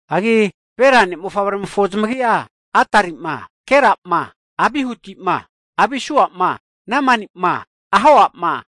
Hagi Bela ne' mofavremofo zamagi'a, Adari'ma, Gera'ma, Abihuti'ma, Abisua'ma, Namani'ma, Ahoa'ma,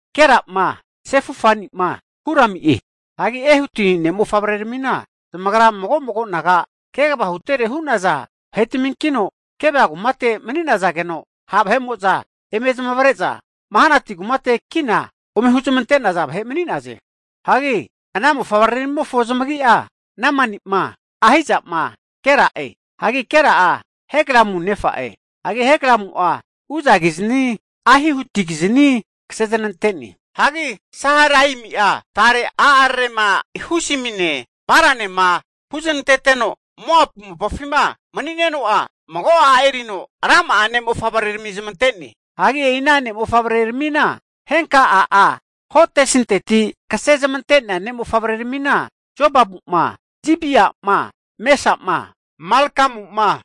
Gera'ma, Sefufani'ma, Hurami'e. Hagi Ehuti ne' mofavreramina zamagra mago mago naga kegava hutere hu'naza vahetminkino, Geba kumate mani'nazageno ha' vahe'mo'za eme huzamante'za zamavare'za Manahati kumate kina ome huzmante'naza vahe mani'naze. Hagi ana mofavreramimofo zamagi'a Namani'ma, Ahiza'ma, Gera'e. Hagi Gera'a Heglamu nefa'e, hagi Heglamu'a Uzakizni Ahihudikizni kasezanante'ne. Hagi Saharaimi'a tare a'ararema Husimine Baranema huznanteteno Moapu mopafima mani'neno'a, mago a' erino rama'a ne' mofavrerami zamante'ne. Hagi e'i ana ne'mofavreramina henka a'a Hodesinteti kase zmante'nea ne' mofavreramina, Jobabu'ma, Zibia'ma, Mesa'ma, Malkamu'ma,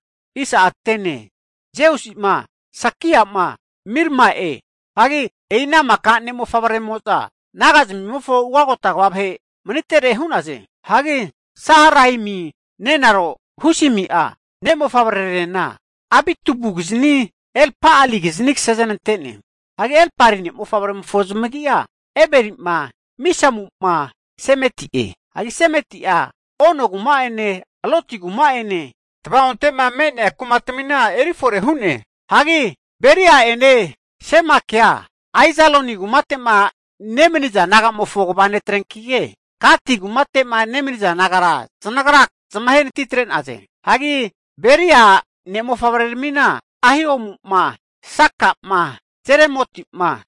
Jeusi'ma, Sakia'ma, Mirma'e. Hagi e'ina maka ne' mofavreramimo'za nagazmimofo ugagota kva vahe manitere hu'naze. Hagi Saharaimi nenaro Husimi'a ne' mofavrerarena Abitubukizni Elpa'alikizani kasezanante'ne. Hagi Elpali ne' mofavreramimofo zamagi'a, Eberi'ma, Misamu'ma, Semeti'e. Hagi Semeti'a Ono kuma'ene Lodi kuma'ene, tava'onte'ma me'nea kumatamina eri fore hu'ne. Hagi Beria'ene Semakea Aijalon kumate'ma nemaniza nagamofo kva netrenkike, Gati kumate'ma nemaniza nagara zanagra zamahe natitre'na'e. Hagi Beria ne' mofavreramina, Ahio'ma, Saka'ma, Jeremoti'ma,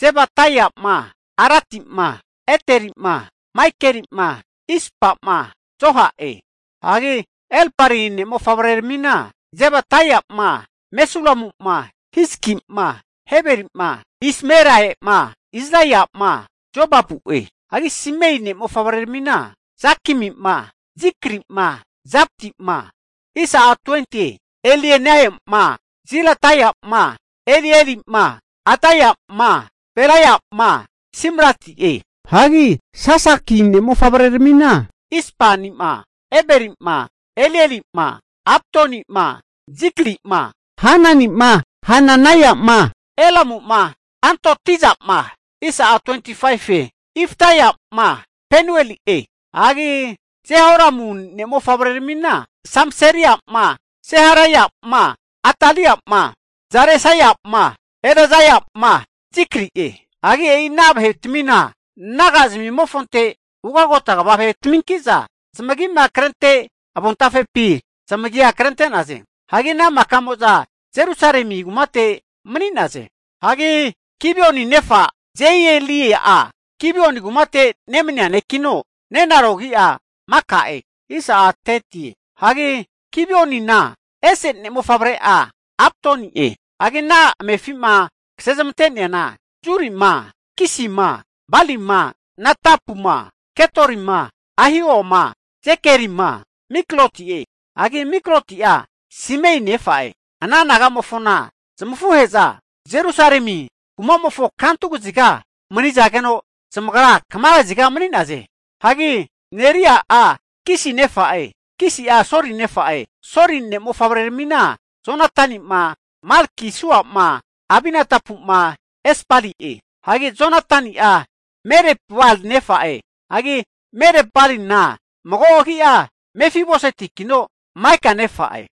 Zebadaia'ma, Aradi'ma, Ederi'ma, Maikeli'ma, Ispa'ma, Joha'e. Hagi Elpali'a ne' mofavreramina, Zebadaia'ma, Mesulamu'ma, Hizki'ma, Heberi'ma, Ismerai'ma, Izlia'ma, Jobabu'e. Hagi Simei ne' mofavreramina, Jakimi'ma, Zikri'ma, Zabdi'ma, Elienai'ma, Zilatai'ma, Elieli'ma, Adaia'ma, Beraia'ma, Simrati'e. Hagi Sasaki ne' mofavreramina, Ispani'ma, Eberi'ma, Elieli'ma, Abdoni'ma, Zikri'ma, Hanani'ma, Hananaia'ma, Elamu'ma Antotiza'ma, Ifdeia'ma, Penueli'e. Hagi Jerohamu ne' mofavreramina, Samserai'ma Seharaia'ma, Atalia'ma, Jaresaia'ma, Elaija'ma, Zikri'e. Hagi e'ina vahetmina naga zmimofonte ugagota kva vahetaminkiza zamagima krente avontafepi zamagia krente'naze. Hagi ana maka'mo'za Jerusalemi kumate mani'naze. Hagi Gibioni nefa Jeieli'a Gibioni kumate nemania nekino, nenaro agi'a Maka'e. Hagi Gibionina ese ne' mofavre'a Abdoni'e'. Hagi ana amefi'ma kasezmante'neana, Zurima, Kisima, Balima Nadapuma, Gedorima Ahioma, Zekerima, Mikloti'e. Hagi Mikloti'a Simei nefa'e. Ana naga'mofona zamafuhe'za Jerusalemi kumamofona kantu kaziga manizage'za, zamagra kama kaziga mani'naze. Hagi Neri'a, Kisi nefa'e, Kisi'a Soli nefa'e. Hagi Soli ne' mofavreramina, Jonatani'ma, Malki-sua'ma, Abinadapu'ma, Esbali'e. Hagi Jonatani'a Merib-bal nefa'e, hagi Marib-balina mago agia Mefibosetikino Maika nefa'e.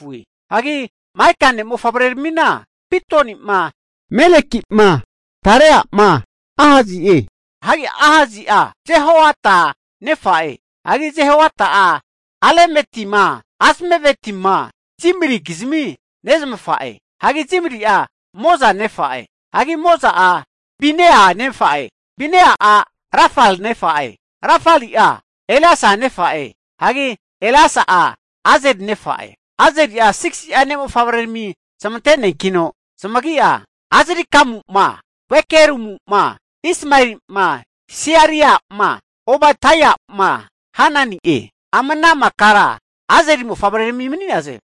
Hagi Maika ne' mofavreramina, Pitoni'ma, Meleki'ma, Tarea'ma, Ahasi'e. Hagi Ahasi'a Jehoada nefa'e, hagi Jehoada'a Alemetima, Azmavetima, Zimrikizmi nezmafa'e. Hagi Zimri'a Moza nefa'e. Hagi Moza'a Binea nefa'e, Binea'a Rafali nefa'e, Rafali'a Eleasa nefa'e, hagi Eleasa'a Azeli nefa'e. Azeli'a 6si'a ne' mofavrerami zamante'neankino zamagi'a, Azrikamu'ma, Bokeru'ma, Ismaeli'ma, Searia'ma, Obaidia'ma, Hanani'e. Ama ana makara Azeli mofavrerami mani'naze.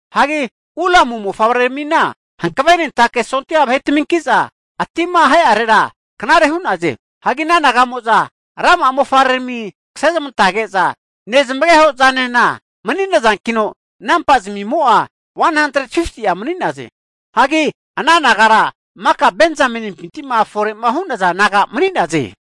Hagi Ulamu mofavreramina hankavenentake sondia vahetaminki'za ati'ma ahe'arera knare hu'naze. Hagi ana naga'mo'za rama'a mofavrerami kasezmantage'za nezamageho zanena mani'nazankino, namba zamimo'a 150'a mani'naze. Hagi ana nagara maka Benzamenimpinti'ma fore'ma hu'naza naga mani'naze.